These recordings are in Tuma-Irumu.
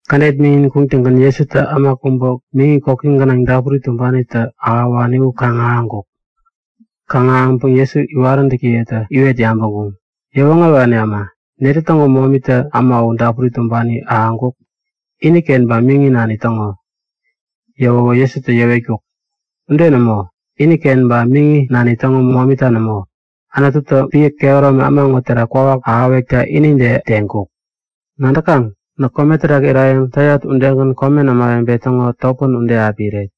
Kädet miŋin kuŋtäŋgän Jesutä äma kubä miŋi koki gänaŋ dapuri tumbanitä ahäwani u kaŋ-ahäŋkuk. Kaŋ-ahäŋpäŋ Jesu iwaräntäkiyetä iwet yabäŋkuŋ; Yäwoŋärewani äma, netä täŋo momita äma u dapuri tumbani ahäŋkuk? Iniken ba miŋi nani täŋo? Yäwäwä Jesutä yäwetkuk; Ude nämo. Iniken ba miŋi nani täŋo momita nämo. Anututä epän kehäromi äma ŋo terak kwawak ahäwekta Anututä inide teŋkuk. Nadäkaŋ? Näk kome terak irayäŋ täyat udegän komen ämawebe täŋo topän ude api iret.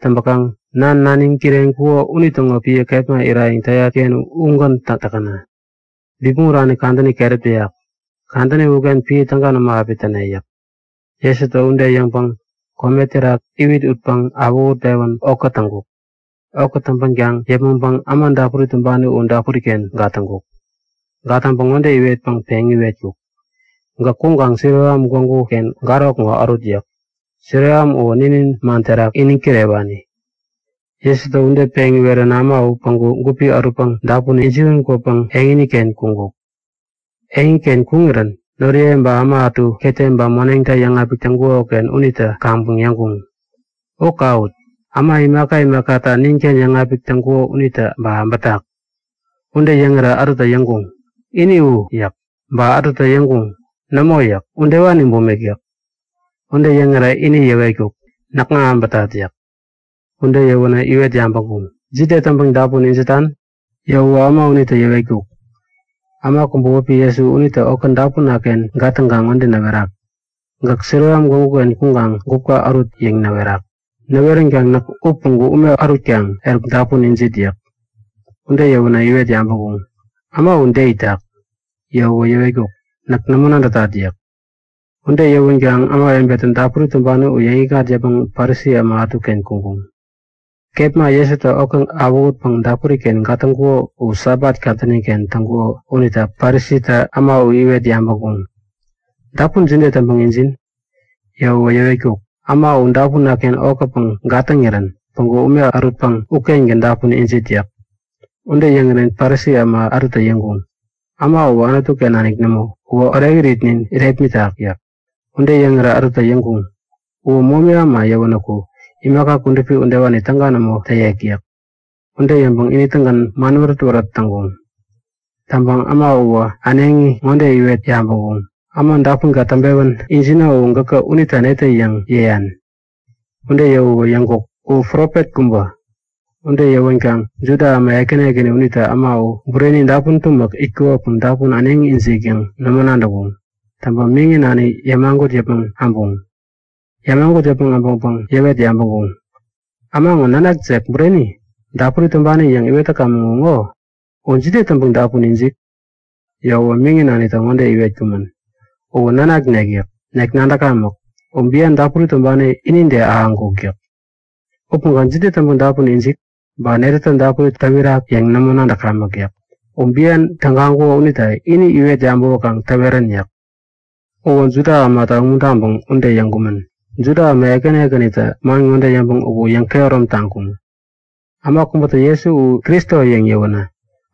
Täŋpäkaŋ Nan, naniŋ kireŋkuko unitäŋo epän kepma irayäŋ täyat-ken ugän täk täkäna. Bipmäŋ urani kadäni keräp täyak. Kadäni uken epän täga nämo api täne yäk. Jesutä ude yäŋpäŋ kome terak iwit utpäŋ awähutpewän okä täŋkuk. Okä täŋpänkaŋ yäpmäŋpäŋ äma dapuri tumbani u dapuri-ken gatäŋkuk. Gatäŋpäŋ ŋode iwetpäŋ peŋ iwetkuk; Gäk kuŋkaŋ Siloam gwägu-ken garok ŋo ärut yäk. (Siloam uwä ninin man terak peŋ iwet-pewän kwani.) Jesutä ude peŋ iweränä äma u päŋku gupi ärutpäŋ dapun ijiwän kwäpäŋ eŋiken kuŋkuk. Eŋiken kuŋirän noriye ba äma ätu ketem ba moneŋta yäŋapik täŋkuko-ken unitä kaŋpäŋ yäŋkuŋ; U kawut! Äma imaka imakata ninken yäŋapik täŋkuko unitä ba äbätak? Ude yäŋirä ätutä yäŋkuŋ; Ini u! yäk. Ba ätutä yäŋkuŋ; Nämo yäk. Udewani bumik yäk. Ude yäŋirä ini yäwetkuk; Näkŋa äbätat! yäk. Ude yäwänä iwet yabäŋkuŋ; Jide täŋpäŋ dapun ijitan? Yäwäwä äma unitä yäwetkuk; Äma kubä wäpi Jesu unitä okä dapuna-ken gatäŋkaŋ ŋode näwerak; Gäk Siloam gwägu-ken kuŋkaŋ gupka ärut yäŋ näwerak. Näweränkaŋ näk u päŋku ume ärutkaŋ eruk dapun ijit yäk. Ude yäwänä iwet yabäŋkuŋ; Äma u de itak? Yäwäwä yäwetkuk; Näk nämo nadätat yäk. Ude yäwänkaŋ ämawebetä dapuri tumbani u yäŋikŋat yäpmäŋ Parisi äma ätuken kuŋkuŋ. Kepma Jesutä okä awähutpäŋ dapuri-ken gatäŋkuko u Sabat kadäni-ken täŋkuko unita Parisitä äma u iwet yabäŋkuŋ; Dapun jide täŋpäŋ ijin? Yäwäwä yäwetkuk; Äma u dapuna-ken okäpäŋ gatäŋirän päŋku ume ärutpäŋ ukengän dapun ijit yäk. Ude yäŋirän Parisi äma ätutä yäŋkuŋ; Äma uwä Anutu-ken nanik nämo. Uwä orekiritnin irepmitak yäk. Ude yäŋirä ätutä yäŋkuŋ; Uwä momi äma yäwänäku imaka kudupi udewani täga nämo täyek yäk. Ude yäŋpäŋ ini-tägän man wärät-wärät täŋkuŋ. Täŋpäŋ äma uwä äneŋi ŋode iwet yabäŋkuŋ; Äma dapunka täŋpewän ijino u gäkä unita netä yäŋ yäyan? Ude yäwäwä yäŋkuk; U profet kubä yäk. Ude yäwänkaŋ Juda äma ekäni ekäni unitä äma u bureni dapun tumäk itkukopäŋ dapun äneŋi ijik yäŋ nämo nadäŋkuŋ. Täŋpäŋ miŋi nani yämagut yäpmäŋ äbuŋ Yämagut yäpmäŋ äbäŋpäŋ yäwet yabäŋkuŋ; Äma ŋo nanakjek bureni? Dapuri tumbani yäŋ iwet täkamän u ŋo? U jide täŋpäŋ dapun ijik? Yäwäwä miŋi nanitä ŋode yäwetkumän; Uwä nanaknek yäk. Nek nadäkamäk, u bian dapuri tumbani inide ahäŋkuk yäk. Upäŋkaŋ jide täŋpäŋ dapun ijik, ba netätä dapuri täwirak yäŋ nämo nadäkamäk yäk. U bian tägaŋkuko unita ini iwet yabäwäkaŋ täwerän yäk. Uwä Juda ämata umuntaŋpäŋ ude yäŋkumän. Juda äma ekäni ekänitä man ŋode yäŋpäŋ uku yäŋkehärom taŋkuŋ; Äma kubätä Jesu u Kristo yäŋ yäwänä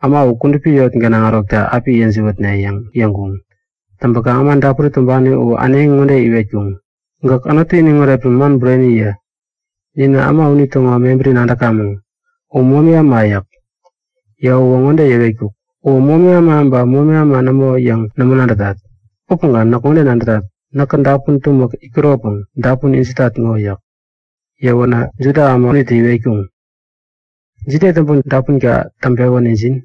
äma u kudupi eŋi gänaŋ ärokta api yäjiwätne yäŋ yäŋkuŋ. Täŋpäkaŋ äma dapuri tumbani u äneŋi ŋode iwetkuŋ; Gäk Anutu iniŋ oretpäŋ man bureni yä! Ninä äma unitäŋo mebäri nadäkamäŋ. U momi äma yäk. Yäwäwä ŋode yäwetkuk; Uwä momi äma ba momi äma nämo yäŋ nämo nadätat. Upäŋkaŋ näk ŋode nadätat; Näkä dapun tumäk itkuropäŋ dapun ijitat ŋo yäk. Yäwänä Juda äma unitä iwetkuŋ; Jide täŋpäŋ dapunka täŋpewän injin?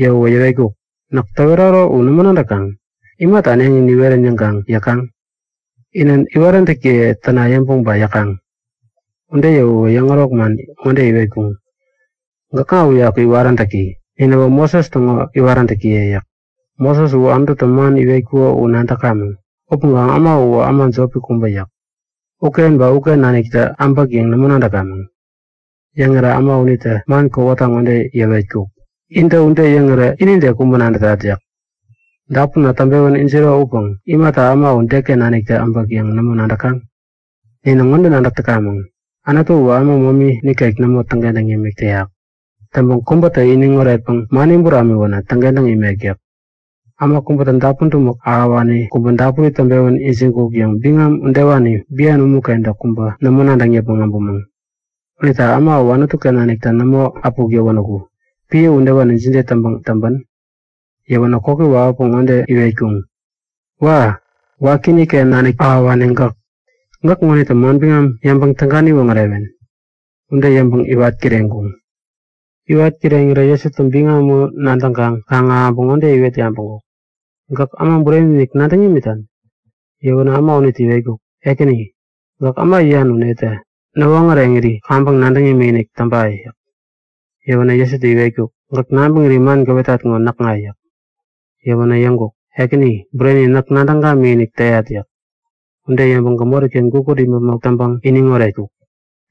Yäwäwä yäwetkuk; Näk täweraro u nämo nadäŋ? Imata äneŋi niwerän yäŋkaŋ yäkaŋ? Inä iwaräntäkiye täna yäŋpäŋ ba yäkaŋ? Ude yäwänä yäŋärok man ŋode iwetkuŋ; Gäkŋa uyaku iwaräntäki. Ninäwä Moses täŋo iwaräntäkiye yäk. Moses uwä Anututä man iwetkuko u nadäkamäŋ. Upäŋkaŋ äma uwä äma jopi kubä yäk. Uken naniktä äbäk yäŋ nämo nadäkamäŋ! Yäŋirä äma unitä man kowata ŋode yäwetkuk; Intä ude yäŋirä inide kubä nadätat yäk. Dapunna täŋpewän ijiro upäŋkaŋ imata äma u deken naniktä äbäk yäŋ nämo nadäkaŋ? Ninä ŋode nadäk täkamäŋ; Anutu uwä äma momi nikek nämo täŋkentäŋ yämik täyak. Täŋpäŋ kubätä iniŋ oretpäŋ mani buramiwänä täŋkentäŋ imek yäk. Äma kubätä dapun tumäk ahäwani kubä dapuri täŋpewän ijiŋkuk yäŋ biŋam udewani bian umu-kentä kubä nämo nadäŋ yäpmäŋ äbumäŋ. Unita äma uwä Anutu-ken naniktä nämo äpuk yäwänäku epän udewani jide täŋpäŋ täŋpän? Yäwänä koki wawäpäŋ ŋode iwetkuŋ; Wa! Wakiinik-ken naniktä ahäwani gäk! Gäk ŋonitä manbiŋam yäŋpäŋ täga niwoŋärewen? Ude yäŋpäŋ iwat kireŋkuŋ. Iwat kireŋirä Jesutä biŋam u nadäŋkaŋ kaŋ-ahäŋpäŋ ŋode iwet yabäŋkuk; Gäk Äma Bureni-inik nadäŋ imitan? Yäwänä äma unitä iwetkuk; Ekäni, gäkä äma yäyan u netä? Näwoŋäreŋiri kaŋpäŋ nadäŋ imikinik täŋpa! yäk. Yäwänä Jesutä iwetkuk; Gäk nabäŋiri man gäwetat ŋo näkŋa yäk. Yäwänä yäŋkuk; Ekäni, bureni! Näk nadäŋ gamikinik täyat yäk. Ude yäŋpäŋ gämori-ken gukut imäpmok täŋpäŋ iniŋ oretkuk.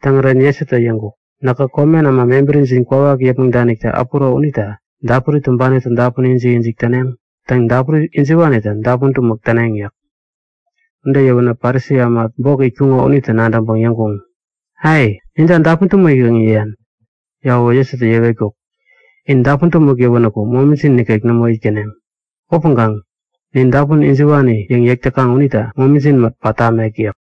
Täŋirän Jesutä yäŋkuk; Näkä komen äma mebärijin kwawak yäpmäŋ danikta äpuro unita dapuri tumbanitä dapun ijik-ijik täneŋ. Täŋ, dapuri ijiwanitä dapun tumäk täneŋ yäk. Ude yäwänä Parisi äma bok itkuŋo unitä nadäŋpäŋ yäŋkuŋ; Ai! Ninta dapun tumäk yäŋ yäyan? Yäwäwä Jesutä yäwetkuk; In dapun tumäk yäwänäku momijin nikek nämo itkäneŋ. Upäŋkaŋ nin dapun ijiwani yäŋ yäk täkaŋ unita momijin mät pat tamek yäk.